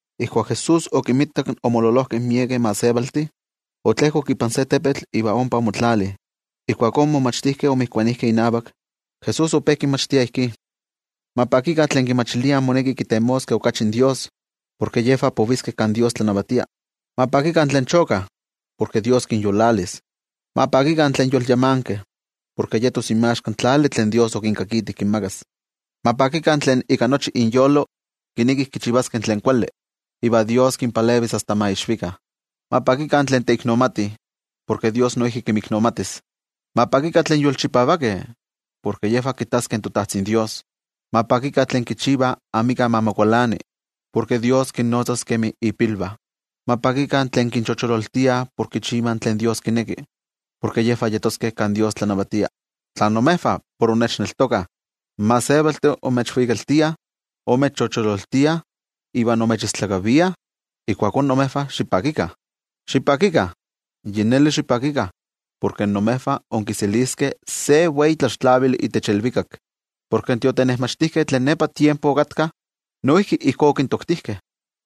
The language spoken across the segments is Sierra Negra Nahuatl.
Ijkuak Jesús okinmitak omololojkeh miekeh gentejtih, otlejkok ipan se tepetl iva ompa omotlali. Ijkuakó in momachtijkeh omotokijkeh inavak. Jesús ope kinmachtia ijkí: —Ma pakikah tlen kimachiliah moneki kitemoskeh okachi in Dios, porke yejvah poviskeh kan Dios tlanavatia. ’Ma pakikah tlen chokah, porke Dios kinyolalis. ’Ma pakikah tlen yolyamankeh, porke yetos inmaxka in tlali tlen Dios okinkakiti kinmakas. ’Ma pakikah tlen ika nochi inyolo kinekih kichivaskeh tlen kuali, iva Dios kinpalevis asta ma ixvikah. ’Ma pakikah tlen teiknomatih, porke Dios noijki kinmiknomatis. ’Ma pakikah tlen yolchipavakeh, porke yejvah kittaskeh toTajtzin Dios. ’Ma pakikah tlen kichivah amika ma mokualani, porke Dios kinnotzas kemi ipilvah. ’Ma pakikah tlen kinchochololtiah por kichivah tlen Dios kineki, porke yejvah yeskeh kan Dios tlanavatia. ’Tla imejvah por innechneltokah, in gentejtih imechvikaltiah, imechochololtiah, iva imechistlakaviah, ijkuakó imejvah xipakikah. Xipakikah, yi neli xipakikah porke imejvah inkiseliskeh se wei tlaxtlavili itech ilvikak. Porke in tiotenejmachtijkeh tlen nepa tiempo okatkah, noijki ijkó okintoktijkeh.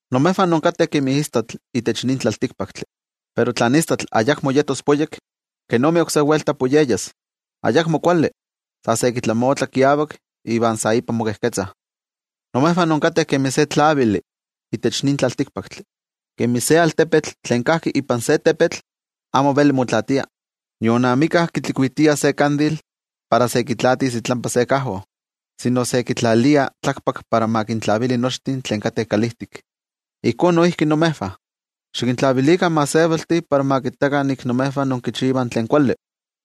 ’Imejvah inkateh kemi istatl itech nin tlaltikpaktli. Pero tla in istatl ayakmo yetos poyek, ¿kenomi oksé welta poyeyas? Ayakmo kuali, sa se kitlamotla kiavak iva sa ipan mokejketzah. ’Imejvah inkateh kemi se tlavili itech nin tlaltikpaktli. Kemi se altepetl tlen kajki ipan se tepetl amo veli motlaatia. Nion amika kitlikuitia se tlavili para kitlaatis itlampa se kajo, sino se kitlalia tlakpak para ma kintlavili nochtin tlen kateh kalijtik. Ijkó noijki imejvah, xikintlavilikah in gentejtih para ma kittakah nik imejvah inkichivah tlen kuali,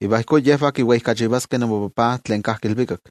iva ijkó yejvah kiweijkachivaskeh imoTajtzi tlen kajki ilvikak.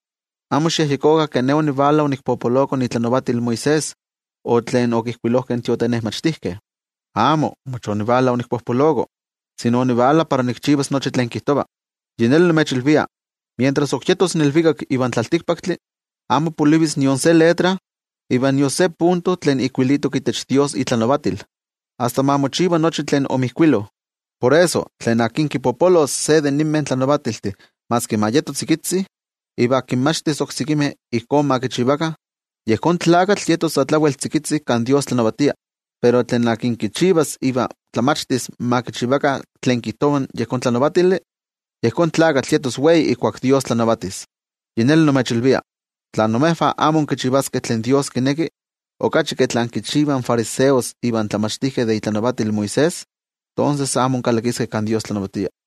’Amo xikyejyekokah ke Ne onivala onikpopoloko itlanavatil Moisés o tlen okijkuilojkeh in tiotenejmachtijkeh. Amo, mach onivala onikpopoloko, sino onivala para nikchivas nochi tlen kijtova. Yi neli nimechilvia, mientras ok yetos ilvikak ivan tlaltikpaktli, amo polivis nion se letra iva nion se punto tlen ijkuilitok itech Dios itlanavatil, asta ma mochiva nochi tlen omijkuilo. Por eso, tlen akin kipopolos se de ninmeh tlanavatiltih maski ma yeto tzikitzi, iva kinmachtis oksekimeh ijkó ma kichivakah, yejón tlakatl yetos sa tlawel tzikitzi kan Dios tlanavatia. Pero tlen akin kichivas iva tlamachtis ma kichivakah tlen kijtova yejón tlanavatili, yejón tlakatl yetos wei ijkuak Dios tlanavatis. Yi neli nimechilvia, tla imejvah amo inkichivaskeh tlen Dios kineki okachi ke tlen kichivah in fariseos ivan tlamachtijkeh de itlanavatil Moisés, tonses amo inkalakiskeh kan Dios tlanavatia.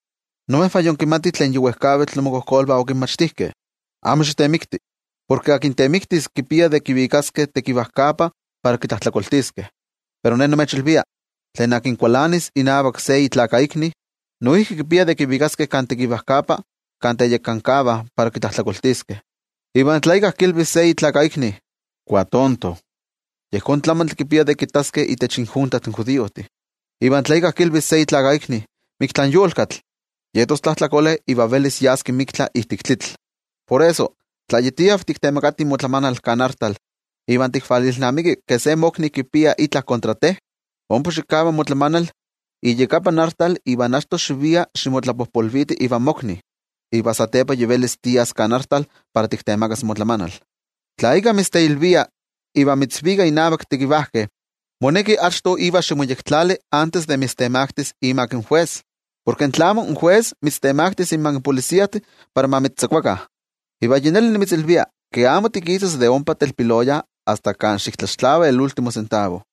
’Imejvah yinkimatih tlen yi wejkavitl imokojkolvah okinmachtijkeh: “Amo xitemikti, porke tlen temiktis kipia de kivikaskeh tekivajkapa para kitlajtlakoltiskeh.” Pero Ne nimechilvia, tlen kualanis inavak se itlakaikni, noijki kipia de kivikaskeh kan tekivajkapa kan teyekankavah para kitlajtlakoltiskeh. Iva tla íkka kilvis se itlakaikni: “Kuatonto”, yejón tlamantli kipia de kittaskeh itech injunta in judiojtih. Iva tla íkka kilvis se itlakaikni: “Miktlan yolkatl”, yetos tlajtlakole iva velis yaski miktla ijtik tlitl. ’Por eso, tla yi tiav tiktemakati motlamanal kan artal iva tikvalilnamiki ke se mokni kualani mova ika itla, ompa xikava motlamanal iyakapan artal iva achto xivia ximotlapojpolviti ivan mokni. Iva satepa yi velis tias kan artal para tiktemakas motlamanal. ’Tla íkka mitzteilvia iva mitzvika innavak tekivajkeh, moneki achto iva ximoyektlali antes de mitztemaktis imak in jues, porke tlamo, in jues mitztemaktis inmak in mayoltih para ma mitztzakuakah. Iva yi neli nimitzilvia ke amo tikisas de ompa telpiloya asta kan amo xiktlaxtlava nochi in tomi tlen mitztlajtlaniliskeh.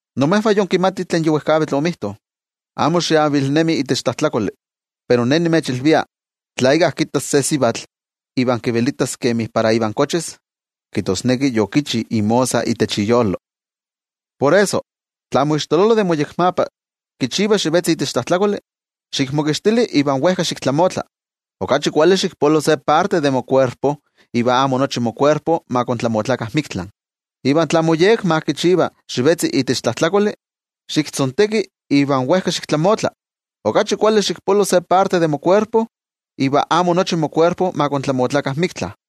’Imejvah yinkimatih tlen yi wejkavitl omijto: “Amo xiavilnemi itech tlajtlakoli.” Pero Ne nimechilvia tla íkka kittas se sivatl iva kivelitas kemi para ivan kochis, kijtosneki yokichi imosa itech iyolo. ’Por eso, tla moixtololo de moyekmapa kichiva xivetzi itech tlajtlakoli, xikmokixtili iva wejka xiktlamotla. Okachi kuali xikpolo se parte de mokuerpo, iva amo nochi mokuerpo ma kontlamotlakah miktla. Iva tla moyekma kichiva xivetzi itech tlajtlakoli, xiktzonteki iva wejka xiktlamotla. Okachi kuali xikpolo se parte de mokuerpo, iva amo nochi mokuerpo ma kontlamotlakah miktla.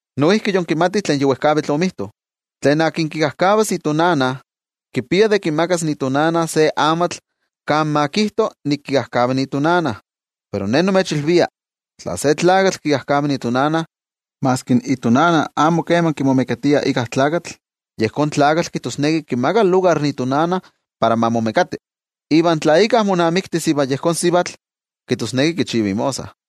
’Noijki yinkimatih tlen yi wejkavitl omijto: “Tlen kikajkavas itonana, kipia de kimakas se amatl kan ma kijto nik kikajkava itonana.” Pero Ne nimechilvia, tla se tlakatl kikajkava itonana, maski itonana amo kema kimomekatia íkka, yejón tlakatl kijtosneki kimaka lugar itonana para ma momekati. Iva tla íkka monamiktis ivan yejón sivatl, kijtosneki kichiva imosa.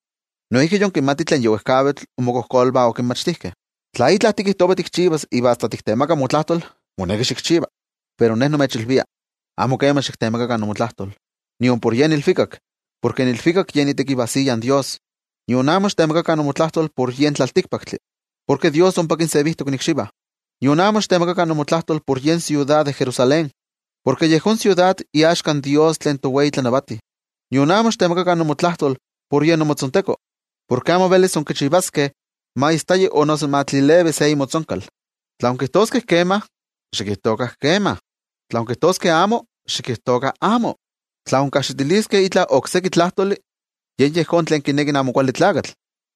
’Noijki yinkimatih tlen yi wejkavitl inmokojkolvah okinmachtijkeh: “Tla itla tikijtova tikchivas iva asta tiktemaka motlajtol, moneki xikchiva.” Pero ne nimechilvia: Amo kema xiktemakakah imotlajtol, nion por yen ilvikak, porke in ilvikak yen itekivajsiya in Dios. Nion amo xiktemakakah imotlajtol por yen tlaltikpaktli, porke Dios ompa kinsevijtok ikxivah. Nion amo xiktemakakah imotlajtol por yen siudad de Jerusalén, porke yejón siudad iaxka in Dios tlen towei tlanavati. Nion amo xiktemakakah imotlajtol por yen imotzonteko, porke amo velis inkichivaskeh ma istaya o noso ma tlilevi se imotzonkal. Tla inkijtoskeh kema, xikijtokah “kema”, tla inkijtoskeh amo, xikijtokah “amo”. Tla inkajxitiliskeh itla okseki tlajtoli, yen yejón tlen kineki in Amo Kuali Tlakatl.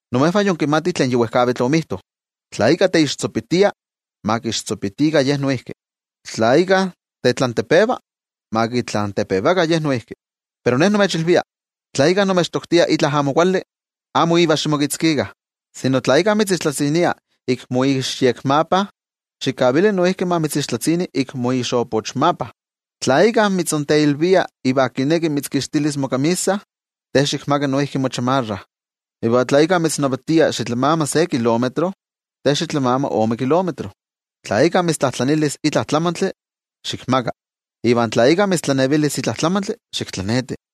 ’Imejvah yinkimatih tlen yi wejkavitl omijto: “Tla íkka teixtzopitia, ma kixtzopitikah ye noijki. Tla íkka tetlantepeva, ma kitlantepevakah ye noijki.” Pero Ne nimechilvia: Tla íkka imechtoktia itla amo kuali, amo ivan ximokitzkikah. Okachi kuali, tla íkka mitzixtlatzinia ik moixyekmapa, xikavili noijki ma mitzixtlatzini ik moixopochmapa. Tla íkka mitzteilvia iva kineki mitzkixtilis mokamisa, te xikmaka noijki mochamarra. Iva tla íkka mitznavatia xitlamama se kilómetro, te xitlamama ome kilómetro. Tla íkka mitztlajtlanilis itla tlamantli, xikmaka. Iva tla íkka mitztlanevilis itla tlamantli, xiktlaneti.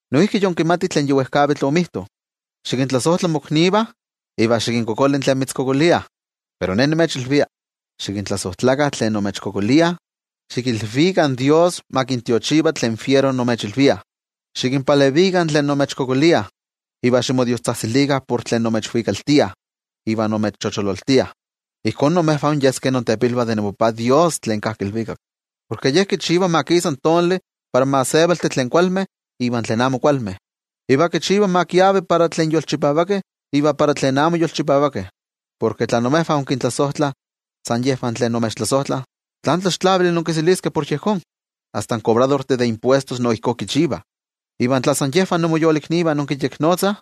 ’Noijki yinkimatih tlen yi wejkavitl omijto: “Xikintlasojtla moknivah, iva xikinkualankaita tlen mitztlavelitah.” Pero Ne nimechilvia: Xikintlasojtlakah tlen imechkualankaitah, xikilvikah in Dios ma kintiochiva tlen fiero imechilviah, xikinpalevikah tlen imechkualankaitah, iva ximodiostzajtzilikah por tlen imechwikaltiah iva imechochololtiah. Ijkó imejvah inyeskeh intepilvah de imoTajtzi Dios tlen kajki ilvikak, porke Ye kichiva ma kisa in tonali para in gentejtih tlen kualmeh iva tlen amo kualmeh. Iva kichiva ma kiavi para tlen tlakamelajkeh iva para tlen amo tlakamelajkeh. Porke tla imejvah inkintlasojtlah san yejvah tlen imechtlasojtlah, ¿tlán tlaxtlavili inkiseliskeh por yejón? Asta in kobradortih de impuestos no ijkó kichivah. Iva tla san yejvah imoyoliknivah inkinyeknotzah,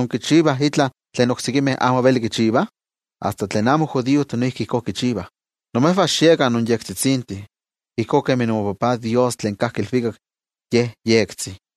¿inkichivah itla tlen oksekimeh amo velih kichivah? Asta tlen amo judiojtih noijki ijkó kichivah. Imejvah xiekah inyektikeh, ijkó kemi imoTajtzi Dios tlen kajki ilvikak Ye yektik.